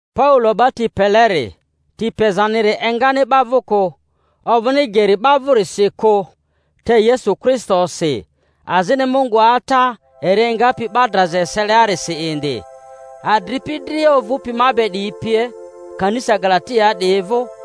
Paulo 'ba ti peleri—ti pezaniri engani 'ba vᴜ kᴜ, ovᴜni geri 'ba vᴜrisi kᴜ, te Yesu Kristosi, azini Mungu Ata eri engapi 'ba draza eseliarisi indi— adripi dria ovᴜpi ma be 'diyi pie, Kanisa Galatiaa 'diyi vᴜ: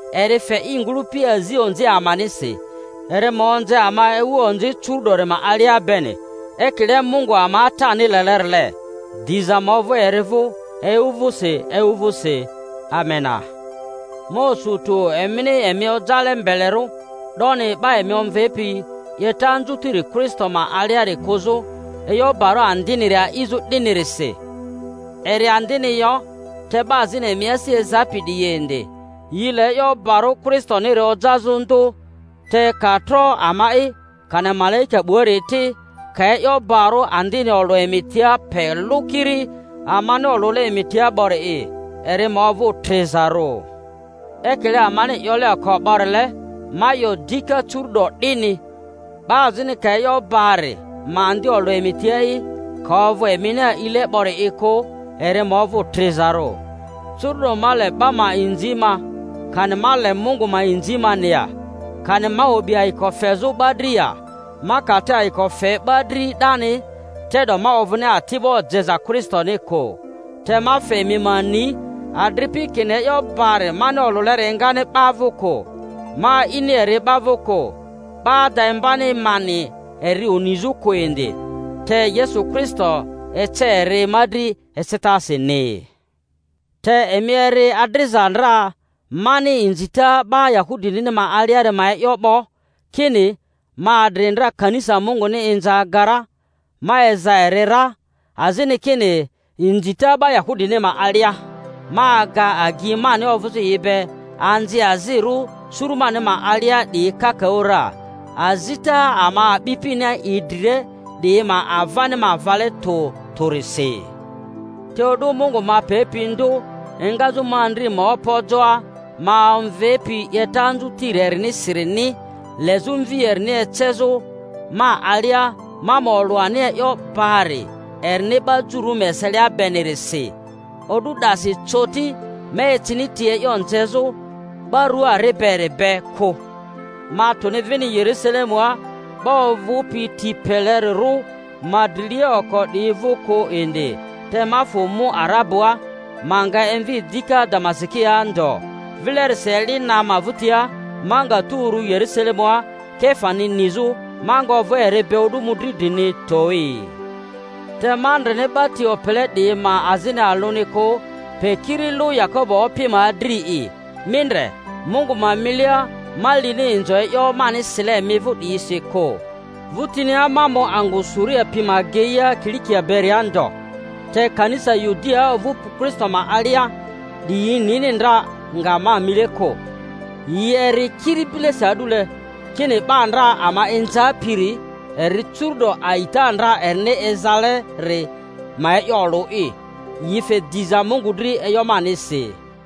eri fe i ngᴜlᴜpi azi onzi amanisi, eri ma onze ama ewu onzi curu'dori ma alia beni, ekile Mungu ama Atani lelerile; diza ma ovᴜ eri vᴜ ewu vᴜsi ewu vᴜsi. Amena. Ma osu tᴜ emini emi ojale mbelerᴜ 'doni, 'ba emi omvepi 'yeta anzutiri Kristoni ma aliari kᴜzᴜ, e'yo barᴜ andiniri a'izᴜ 'dinirisi— eri andini yo, te 'ba azini emi asi ezapi 'diyi indi, yi le e'yo barᴜ Kristoniri ojazᴜ ndᴜ. Te ka tro ama'i, kani malaika 'buari ti, ka e'yo barᴜ andini olᴜ emi tia pe lᴜ kiri amani olule emi tia 'bori'i, eri ma ovᴜ trizarᴜ. Ekile amani 'yole oko 'borile, ma 'yo dika curu'do 'dini, 'Ba azini ka e'yo bari ma andi olᴜ emi tia'i, ka ovᴜ emini a'ile 'bori'i kᴜ, eri ma ovᴜ trizarᴜ. Curu'do ma le 'ba ma inzi ma, kani ma le Mungu ma inzi mani ya? Kani ma o'bi ayiko fezᴜ 'ba dri ya? Ma ka te ayiko fe 'ba dri 'dani, te'do ma ovᴜni ati'bo jeza Kristoni kᴜ. Te ma fe emi ma ni, adripi, kini e'yo bari mani olᴜleri engani 'ba vᴜ kᴜ. Ma a'ini eri 'ba vᴜ kᴜ, 'ba ada imbani mani eri Onizᴜni kᴜ indi, te Yesu Kristo ece eri ma dri ecetasini. Te emi eri adriza ndra mani inzita 'ba Yahudini ma aliari ma e'yo 'bo, kini ma adri ndra kanisa Munguni inza aga ra, ma eza eri ra; azini kini inzita 'ba Yahudini ma alia, ma aga agyi mani ovᴜzᴜ yi be anziazirᴜ suru mani ma alia 'diyi kakaᴜ ra, azita ama a'bipini idrile 'diyi ma avani ma vale tᴜ tᴜrisi. Te o'du Mungu ma pepi ndᴜ engazᴜ ma andri ma opojoa, ma omvepi 'yeta anzutiri erinisirini lezᴜ Mvi erini ecezᴜ ma alia, ma ma olᴜ ani e'yo bari erini 'ba Jururᴜ ma eselia benirisi, o'du 'dasi coti ma ecini ti e'yo nzezᴜ 'ba rua ari beri be kᴜ, ma tuni vini Yerusalemua 'ba ovᴜpi ti pelerirᴜ ma drilia oko 'diyi vᴜ kᴜ indi, te ma fᴜ mu Arabua; ma nga emvi dika Damasikia ndo. Vilerisi, eli na ma vᴜtia, ma nga tu uru Yerusalemua Kefani nizᴜ, ma nga ovᴜ eri be o'du mᴜdri drini towi. Te ma ndreni 'ba ti opele 'diyi ma azini alᴜni kᴜ, pe kiri lᴜ Yakobo Opi ma adri'i. (Mi ndre, Mungu ma milia, ma lini inzo e'yo mani sile emi vᴜ 'diyisi kᴜ!) Vᴜtinia ma mu angᴜ Suria pi ma ageia Kilikia beria ndo. Te kanisa Yudiaa ovᴜpi Kristo ma alia 'diyi nini ndra nga ma mile kᴜ; yi eri kiri bilesi a'dule kini, 'Ba ndra ama inzapiri, eri curu'do a'ita ndra erini ezaleri ma e'yo olᴜ'i. Yi fe diza Mungu dri e'yo manisi.